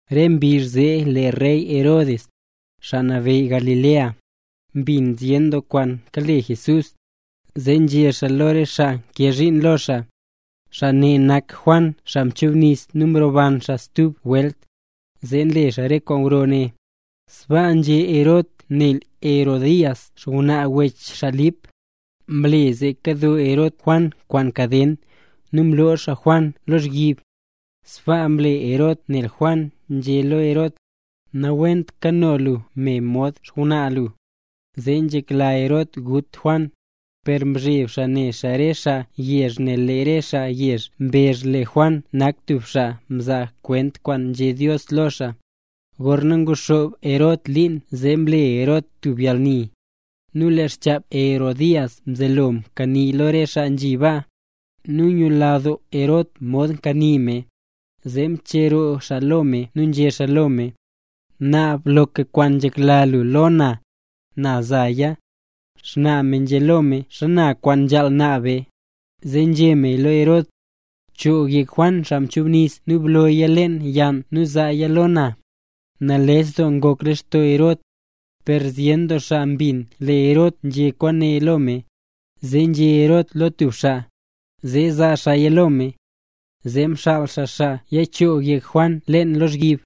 Re mbizh zee lee rey Herod, xaa nabeyy Galilea, mbin zyen doo kwaan kale Jesús. Zee nzhé xaa lo re xaa nkee zhiin lo xaa: —Xaa ne nak Juan xaa mchubnis nu mroban xaa stub welt, zee nle xaa re kwaan gro ne. Sbaa nzhé Herod nel Herodías, xngwnaa wech xaa Lip, mle zee mkado Herod Juan kwaan kaden, nu mlo xaa Juan lozhyib. Sbaa mle Herod nel Juan nzhé lo Herod: —Nawent kano lu me mod xngwnaa lu. Zee nzhekla Herod gut Juan, per nzheb xaa ne xaa re xaa yezh, nel lee re xaa yezh mbezh lee Juan nak tub xaa nzaa kwent kwaan nzhé Dios lo xaa. Gorna nguxoob Herod liin zee mle Herod tub yalni. Nu lee xchap Herodías mzelo mkanii lo re xaa nzhi baa, nu ngula doo Herod mod mkanii me, zee mcheroo xaa lo me nu nzhé xaa lo me: —Naab loka kwaan nzhekla lu lo na, na zaaya. Xnaa me nzhé lo me xana kwaan nzhaal naab me, zee nzhé meya lo Herod: —Choog yek Juan Xaa Nchubnis nu blooya leen yann nu zaaya lo na. Nales doo ngok lextoo Herod. Per zyen doo xaa mbin lee Herod nzhé kwaane lo me, zee nzhé Herod lo tub xaa, zee zaa xaaya lo me. Zee mxaal xaa xaa yachoog yek Juan leen lozhyib.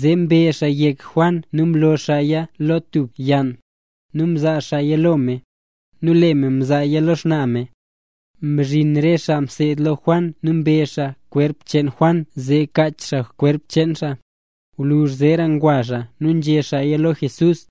Zee mbe xaa yek Juan nu mloo xaaya lo tub yann, nu mzaa xaaya lo me, nu lee me mzaaya lo xnaa me. Mzhin re xaa mseed lo Juan nu mbe xaa kwerp cheen Juan zee kach xaa xkwerp xaa. Gwluzh zeera ngwa xaa nu ngwayé xaaya lo Jesús.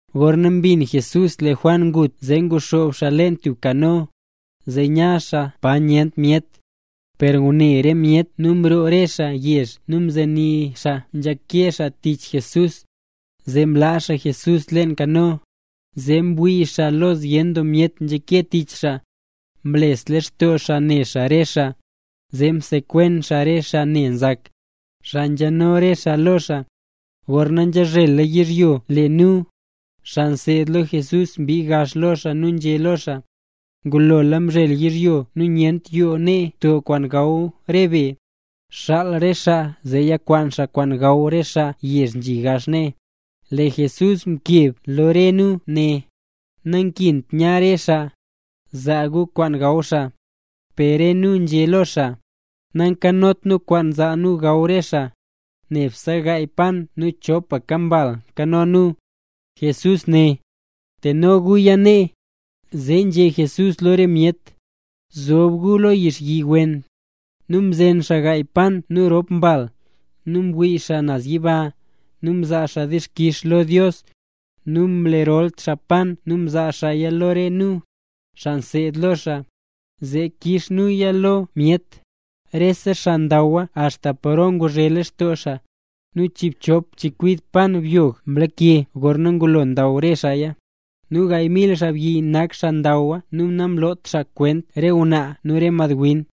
Gorna mbin Jesús lee Juan ngut, zee nguxoob xaa leen tub kano, zee ya xaa pa nyent myet. Per ngune re myeta nu mroo re xaa yezh nu nzenii xaa nzhake xaa tich Jesús. Zee mla Jesús leen kano, zee mwii xaa lo zyen doo myet nzhake tich xaa. Mles lextoo xaa ne xaa re xaa, zee msekwen xaa re xaa ne nzak, xaa nzhano re xaa lo xaa. Gorna nzhazhela yizhyo lee nu, xaa mseed lo Jesús, mbii gax lo xaa nu nzhé nu lo xaa: —Ngulola mzhel yizhyo nu nyent yoo nee to kwaan gaw re be. Xaal re xaa zee yakwaan xaa kwaan gaw xaa re yezh nzhi gax nee. Lee Jesús mkeb lo re nu né: —Nankint nya re xaa. Zaa gu kwaan gaw xaa. Per re nu nzhé lo xaa: —Nankanot nu kwaan zaa nu gaw re xaa, nebse gaaya pan nu chopaka mbal nkano nu. Jesús né: —Teno guya nee. Zee nzhé Jesús lo re myet: —Bzob gu lo yixyi wen. Nu mzen xaa gaaya pan nu rop mbal, nu mwii xaa naz yiba, nu mzaa xaa dixkix lo Dios. Nu mle rol xaa pan nu mzaa xaaya lo re nu, xaa mseed lo xaa, zee kiiz nuya lo re myet. Rese xaa ndaw axta paro nguzhe lextoo xaa. Nu chiibchop chekwid pan byog mlake gorna ngulo ndaw re xaaya. Nu gaay mil xaabyi nak xaa ndawa nu namloot xaa kwent re ngwnaa nu re madwin.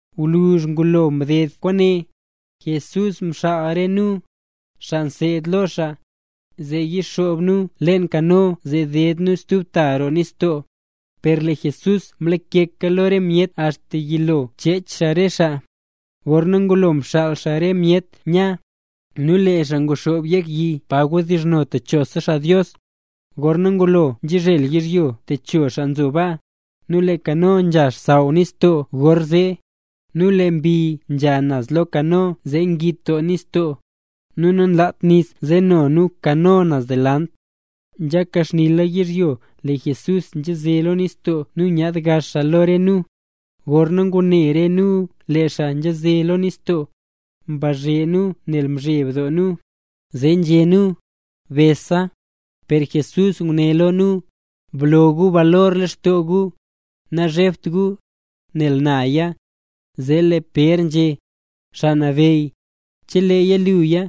Gwluzh ngulo mded kwaane, Jesús mxaal re nu, xaa mseed lo xaa, zee yixoob nu leen kano zee deed nu stub ta roo nistoo. Per lee Jesús mlakeka lo re myet axta yilo chech xaa re xaa. Gorna ngulo mxaal xaa re myet nya, nu lee xaa nguxoob yek yi pa wdizhno techosa xaa Dios. Gorna ngulo mzhel yizhyo techo xaa nzo baa. Nu lee kano nzha xsaww leen nistoo gorzee. Nu lee mbi nze naz lo kano zee ngit doo nistoo, nu nanlat nis nzeno nu kano naz delant. Nzhaka xnila yizhyo lee Jesús nzhaze lo nistoo nu nyaad gax lo re nu. Gorna ngune re nu lee xaa nzhaze lo nistoo, mbazhe nu nel mzheb doo nu, zee nzhé nu: —¡Besa! Per Jesús nguné lo nu: —Blo gu balor lextoo gu, nazhebt gu, nel naya. Zee lee Pér nzhé: —Xaa Nabeyy, cheleeya luya,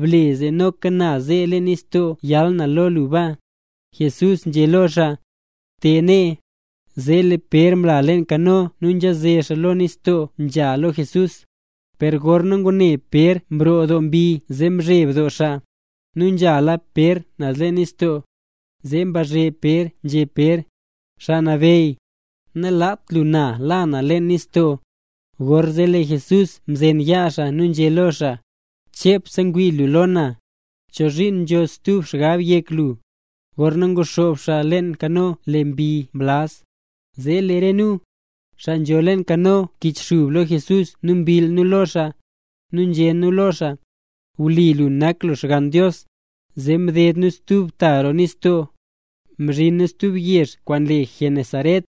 ble zee noka na ze lo nistoo yal lo lu baa. Jesús nzhé lo xaa: —Te nee. Zee lee Pér mla leen kano nu nzhaze xaa lo nistoo nzha lo Jesús. Per gorna ngune Pér nroo doo mbi zee mzheb doo xaa, nu nzhala Pér naz leen nistoo. Zee mbazhe Pér nzhé Pér: —Xaa Nabeyy, nalaat lu la na leen nistoo. Gorzee lee Jesús mzen yaa xaa, nu nzhé lo xaa: —¡Chepse ngwii lu lo na! ¿Chozhiin nzho stub xgab yek lu? Gorna nguxoob xaa leen kano lee mbi mlaz. Zee lee re nu, xaa nzho leen kano mkichxub lo Jesús nu mbill nu lo xaa, nu nzhé nu lo xaa: —Wlipa lu nak Xgann Dios. Zee mded nu stub ta roo nistoo, mzhin nu tub yezh kwaan le Genesaret.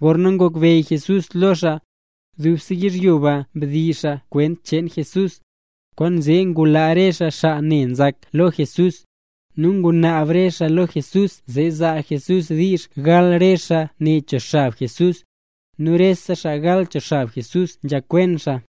Gorna ngokbeyy Jesús lo re xaa, dubse yizhyo ba mdizh xaa kwent cheen Jesús. Kwaanzee ngulaa re xaa xaa ne nzak lo Jesús. Nu ngunaab re xaa lo Jesús, zee zaa Jesús diizh gal re xaa ne cho xab Jesús, nu re xaa mgal cho xab Jesús nzhakwen xaa.